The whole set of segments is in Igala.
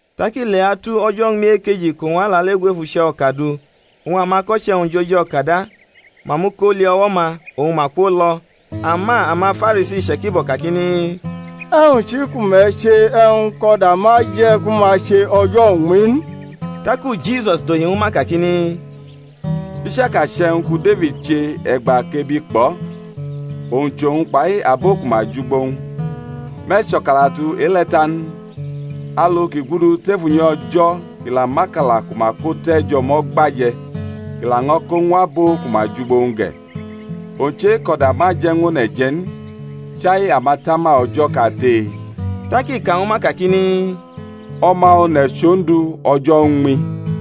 Tak i leatu o̩jo̩ uñmi ekeji kʼowñ alalegu ef uche̩ o̩ka du; oñ amako̩che̩-wñ jʼoji-o̩ka da, ma muko li o̩wo̩-ma, oñ ma kwolo̩. Ama amaFarisi iche̩kibo̩ kakini, E̩wñ chi ku me̩ che e̩wñ kʼo̩da ma je̩ ku ma che o̩jo̩ uñmi n? Taku Jisua dohi ñwu ma kakini, I chaka chʼe̩wñ ku Defid che e̩gba kʼebi kpʼo̩, owñ chʼowñ kpai abo ku ma jʼugbo-wñ, me̩ cho̩kalatu e-le̩ ta n? alu kʼi gudu tef unyi O̩jo̩ kʼi la mʼakala ku ma ko te̩ jʼo̩mo̩ gba je̩, kʼi laño̩ ko ñw abo ku ma jʼugbo-wñ ge̩; owñ chʼe-kʼo̩da ma je̩ ñw one̩ je̩ n, chai amatama O̩jo̩ kate? Tak i ka ñwu ma kakini, O̩ma One̩ chʼOndu o̩jo̩ uñmi.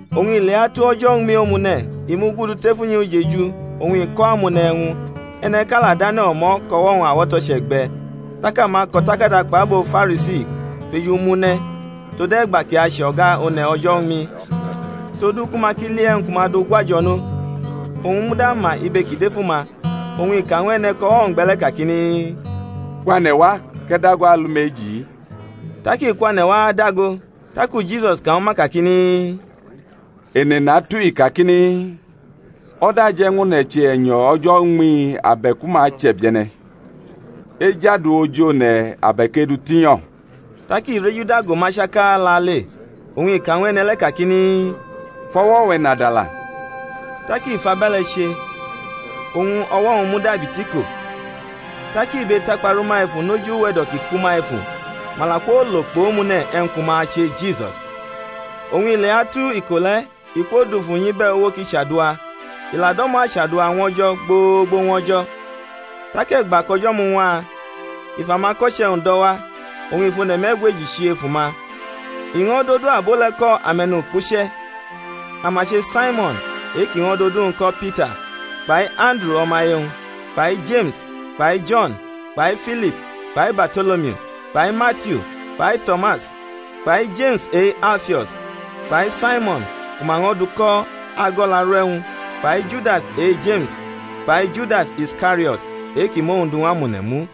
Oñ i leatu o̩jo̩ uñmi omune̩ i mugudu tef unyi ujeju oñ i ko̩ amone̩ e̩wñ; e̩ne̩ʼka la dʼane̩ o̩me̩ kʼo̩wo̩-wñ awo̩to̩ che̩gbe̩. Tak amako̩takada kpʼabo Farisi fʼeju mʼu ne̩ tode̩gba kʼi ache o̩ga one̩ o̩jo̩ uñmi; todu ku ma ki li e̩wñ ku ma du gwajo̩nʼo. Owñ muda ma ibe ki dʼef uma, oñ i ka ñw e̩ne̩ kʼo̩wo̩-wñ gbe̩ le̩ kakini, Kwane̩ wa kʼe̩ dago alumeji-i. Tak i kwane̩ wa adago. Taku Jisus ka ñwu ma kakini, Ene natu-i kakini, O̩da aje̩ ñw one̩ che e̩nyo̩ o̩jo̩ uñmi abe̩ku ma chʼe̩bie̩ne̩? Ejadu oji one̩ abe̩k edutinyo̩? Tak i rejuda go ma chaka lale, oñ i ka ñw e̩ne̩ le̩ kakini, Fʼo̩wo̩-we̩ nadala. Tak i fʼabe̩le̩ che, oñ o̩wo̩-wñ mudabi tiko. Tak ibe takpa rʼuma efu nʼoji uwe̩do̩ ki kʼuma efu; ma la kwolo kpʼomune̩ e̩wñ ku ma ache Jisus. Oñ ileatu iko le̩ i kwodufu nyʼibe̩uwo kʼi chadua; i la do̩mo̩ achadua ñw O̩jo̩ gbogbo ñw o̩jo̩. Tak e̩gba kʼo̩jo̩ muñwa, i fʼamako̩che̩-wñ do̩ wa; oñ i fʼone̩ me̩gweji chi efu ma; i ño̩ dʼodu abo le̩ ko ame̩nukpuche̩. Ama che Saimo̩n e-ki ño̩ dʼodu-wñ ko̩ Pita, kpai Anduru o̩maye-wñ, kpai Jeme̩s kpai Jo̩n, kpai Filip kpai Barto̩lomiu, kpai Matiu kpai To̩mas, kpai Jeme̩s e-Alfio̩s, kpai Saimo̩n ku ma ño̩ du ko̩ Ago̩laru e̩wñ, kpai Judas e-Jeme̩s, kpai Judas Iskario̩t e-ki mʼowñ du ñw amone̩ mu.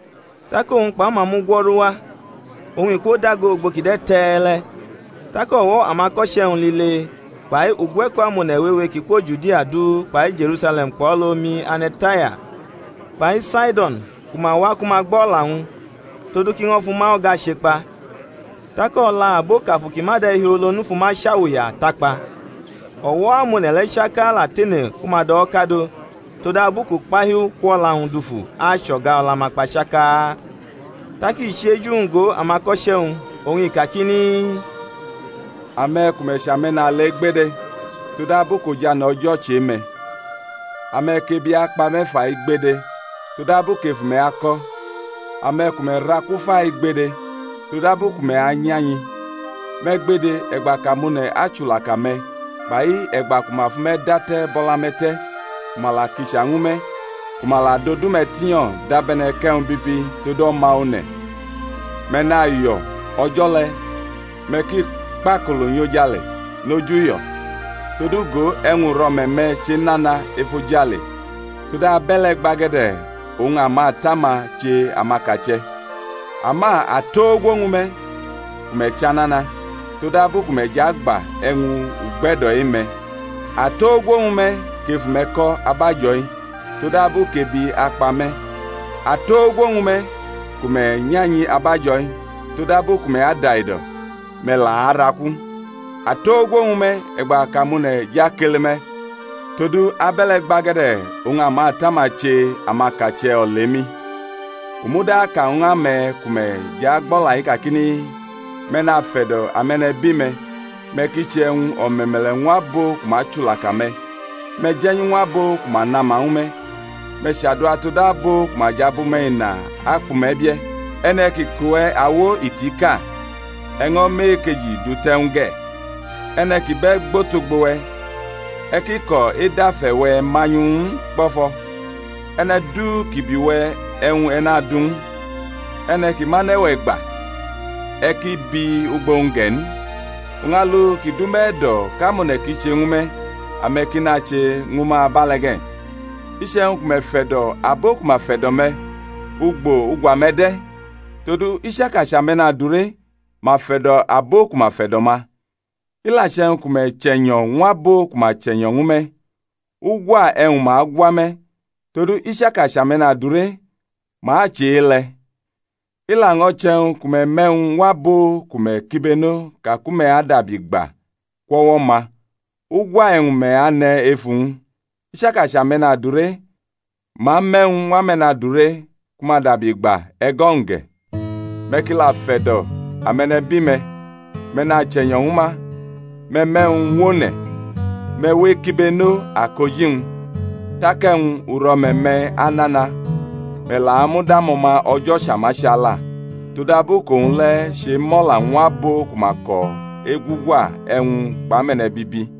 Tak owñ kpʼama mugwo̩ru wa, oñ i kwodago ugbo ki de̩ te̩e̩le̩, tak o̩wo̩ amako̩che̩-wñ lile kpai ugwe̩ko̩ amone̩ wewe ki kwo Judia du kpai Je̩rusale̩m kpʼo̩lʼomi ane̩ Taya kpai Saido̩n ku ma wa ku ma gbʼo̩la-wñ, todu kʼi ño̩ fʼuma o̩ga chekpa. Tak o̩la abo kʼamafu ki ma de̩hiolo n fu ma chawuya takpa. O̩wo̩-amone̩ le̩ chaka la tene ku ma dʼo̩wo̩ kadʼo; todabu kʼukpahiu kwʼo̩la-wñ dufu achʼo̩ga-o̩la-ma kpa chaka. Tak i chi eju-wñ go amako̩che̩-wñ, oñ i kakini: Ame̩ ku me̩ chʼame̩nale gbede, todabu kʼojane̩ O̩jo̩ chʼe-me̩. Ame̩ kʼebi akpa me̩ fai gbede, todabu kʼefu-me̩ ako̩. Ame̩ ku me̩ raku fai gbede, todabu ku me̩ anya-nyi. Me̩ gbede, e̩gba kʼamone̩ achulaka me̩, kpai e̩gba ku ma fʼume̩ date̩ bʼo̩la-ma te̩ ku ma la kicha ñwu me̩, ku ma la dʼodu-me̩ tinyo̩ dabe̩ne̩ kʼe̩wñ bibi tod O̩ma One̩. Me̩ nayo̩ o̩jo̩ le̩, me̩ ki kpakolo nyʼojale noj uyo̩; todu go, e̩wñ uro̩me̩-me̩ chenana efojale; todu abe̩le̩ gbage̩de̩ oñ amata-ma che amakache̩. Ama atogwo ñwu me̩ ku me̩ chʼanana! todabu ku me̩ jʼagba e̩wñ ugbe̩do̩ e-me̩. Atogwo ñwu me̩, kʼefu-me̩ ko̩ abajo̩-i! todabu kʼebi akpa me̩. Atogwo ñwu me̩, ku me̩ nyanyi abajo̩-i! todabu ku me̩ adaido̩, me̩ la araku. Atogwo ñwu me̩ e̩gba kʼamone̩ jʼakele me̩! todu abe̩le̩ gbage̩de̩ oñ amata-ma che amakache̩ olemi. U muda aka ñw ame̩ ku me̩ jʼagbʼo̩la-i kakini, Me̩ nafe̩do̩ ame̩nebi-me̩; me̩ ki che e̩wñ o̩me̩me̩le̩ ñw abo ku ma chulaka me̩; me̩ je̩nyu ñw abo ku ma nama ñwu me̩, me̩ chadua tod abo ku ma jʼabʼume̩ ina akpʼume̩ bie̩. E̩ne̩ ki kʼuwe̩ awo itiʼka, e̩ ño̩ mʼe-ekeji du te̩ ñw u ge̩; e̩ne̩ ki bʼe̩ gbʼotogbo-we̩, e̩ ki ko̩ edʼafe̩-we̩ manyu ñw u n kpo̩fo̩. E̩ne̩ du ki bi we̩ e̩wñ e̩ nadu ñw u; e̩ne̩ ki mʼane̩-we̩ gba, e̩ ki bi ugbo-wñ ge̩ n. Oñ alu ki dʼume̩ e̩do̩ kʼamone̩ ki che ñwu me̩, ame̩ ki nache ñwu ma abe̩le̩ ge̩. Iche̩wñ ku me̩ fe̩do̩ abo ku ma fe̩do̩ me̩, ugbo ugwa-me̩ de̩? todu i chaka chʼame̩nadure, ma fe̩do̩ abo ku ma fe̩do̩ ma. I la che̩wñ ku me̩ chʼe̩nyo̩ ñw abo ku ma chʼe̩nyo̩ ñwu me̩, ugwa e̩wñ ma agwa me̩? todu i chaka chʼame̩nadure, ma che e-le̩. I laño̩ che̩wñ ku me̩ me̩ e̩wñ ñw abo ku me̩ kibeno ka ku me̩ adabi gba kwʼo̩wo̩-ma, ugwa e̩wñ me̩ ane̩ ef uwñ? I chaka chʼame̩nadure, ma me̩ e̩wñ ñw ame̩nadure ku ma dabi gba e̩go̩-wñ ge̩. Me̩ ki la fe̩do̩ ame̩nebi-me̩, me̩ nachʼe̩nyo̩ ñwu ma, me̩ me̩ e̩wñ ñw one̩, me̩ we ekibeno akoji-wñ; tak e̩wñ uro̩me̩-me̩ anana, me̩ la amud amo̩ma O̩jo̩ Chamachala; todabu kʼowñ le̩ chemo̩la ñw abo ku ma ko̩ egwugwa e̩wñ kpʼame̩ne̩bibi.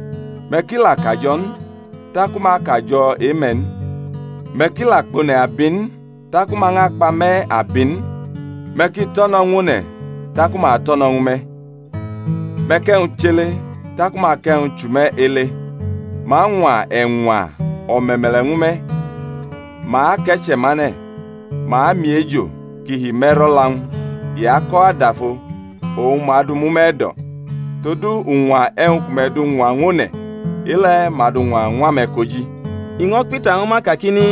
Me̩ ki la kajo̩ n taku ma akajo̩ e-me̩ n; me̩ ki la kpʼone̩ abi n, taku ma ñʼakpʼame̩ abi n; me̩ ki tʼo̩ no̩ ñw one̩, taku ma atʼo̩ no̩ ñwu me̩; me̩ kʼe̩wñ chʼele, taku ma akʼe̩wñ chʼume̩ ele; ma añwa e̩ñwa o̩me̩me̩le̩ ñwu me̩, ma ake̩che̩mane̩, ma amiejo ki hime̩rʼo̩la-wñ, i ako̩ adaho, oñ ma adʼu mʼume̩ e̩do̩. Todu uñwa e̩wñ ku me̩ du ñwa ñw one̩, e-le̩ ma adu ñwa ñw ame̩ koji. I ño̩ kpita ñwu ma kakini,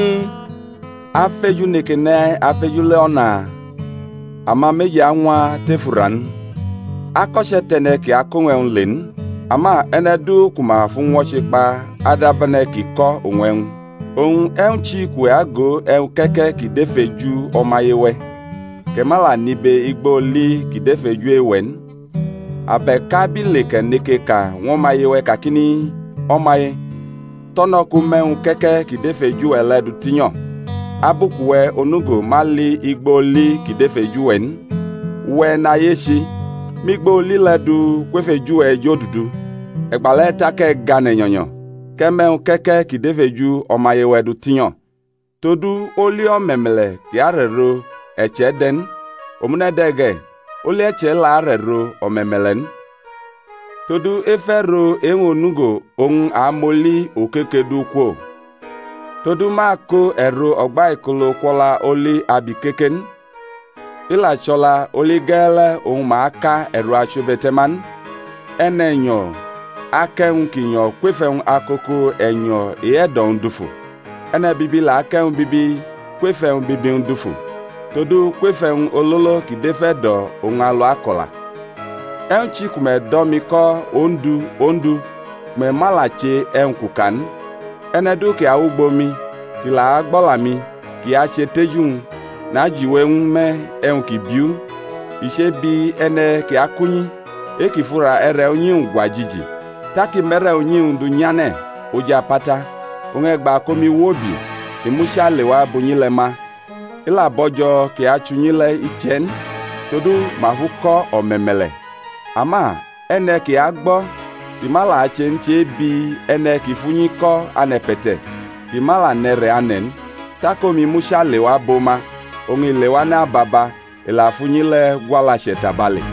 Afeju neke ne̩ afeju le̩ o̩na? Ama meji añwa tef ura n? Ako̩che̩ tʼe̩ne̩ ki ako̩ owñ e̩wñ le n; ama e̩ne̩ du ku ma fʼu ñwo̩che kpa adab e̩ne̩ ki ko̩ owñ e̩wñ. Oñ e̩wñ chi kʼuwe̩ ago e̩wñ ke̩ke̩ ki dʼef eju o̩maye-we̩, kʼe̩ ma la nibe igbo oli ki dʼef eju e-we̩ n? Abe̩k abile kʼe̩ neke ka ñw o̩maye-we̩ kakini, O̩maye, to̩no̩ kʼu mʼe̩wñ ke̩ke̩ ki dʼef eju-we̩ le̩ dutinyo̩, abu kʼuwe̩ onugo ma li igbo oli ki dʼef eju-we̩ n? Uwe̩ e̩nayechi, mʼigbo oli le̩ du kwef eju-we̩ ejodudu, e̩gba le̩ tak e̩ gane̩ nyo̩nyo̩ kʼe̩ mʼe̩wñ ke̩ke̩ ki dʼef eju o̩maye-we̩ dutinyo̩. Todu oli o̩me̩me̩le̩ ki arʼe̩ro e̩che̩ de̩ n; omune̩ ge̩, oli e̩che̩ la arʼe̩ro o̩me̩me̩le̩ n. Todu ef e̩ro e-wñ onugo oñ ma amʼoli okoke du kwo. Todu ma ako e̩ro ugbaikolo̩ kwʼo̩la oli abikeke n, i la chʼo̩la olige̩e̩le̩ oñ ma aka e̩ro achiwebe̩te̩ma n. E̩ne̩nyo̩ akʼe̩wñ ki nyo̩ kwef e̩wñ akoko e̩nyo̩ e-e̩do̩-wñ dufu; e̩ne̩bibi la akʼe̩wñ bibi kwef e̩wñ bibi-wñ dufu; todu kwef e̩wñ ololo ki dʼef e̩do̩ oñ alu ako̩la. E̩wñ chi ku me̩ do̩ mi ko̩ Ondu, Ondu, ku me̩ ma la che e̩wñ kʼu ka n? E̩ne̩ du ki awʼugbo mi, kʼi la agbʼo̩la-mi, kʼi ache tʼeju-wñ, najiwe ñwu me̩ e̩wñ kʼi biu. I che̩bi e̩ne̩ ki akʼunyi, e-kʼi fʼura e̩re̩ unyi-wñ gwa jiji, tak i mʼe̩re̩ unyi-wñ du nyʼane̩ oj apata; oñ e̩gba kʼomi wobi, i mucha lewa bʼunyi le̩ ma, i la bo̩jo̩ kʼi achʼunyi le̩ iche̩ n, todu ma fʼu ko̩ o̩me̩me̩le̩. Ama e̩ne̩ ki agbo̩, kʼi ma la che n che̩bi e̩ne̩ ki fʼunyi ko̩ ane̩pe̩te̩, kʼi ma nʼe̩re̩ ane̩ n; tak omi mucha lewa bʼo ma, oñ i lewane̩ ababa, i la fʼunyi le̩ gwʼalache̩ tabale.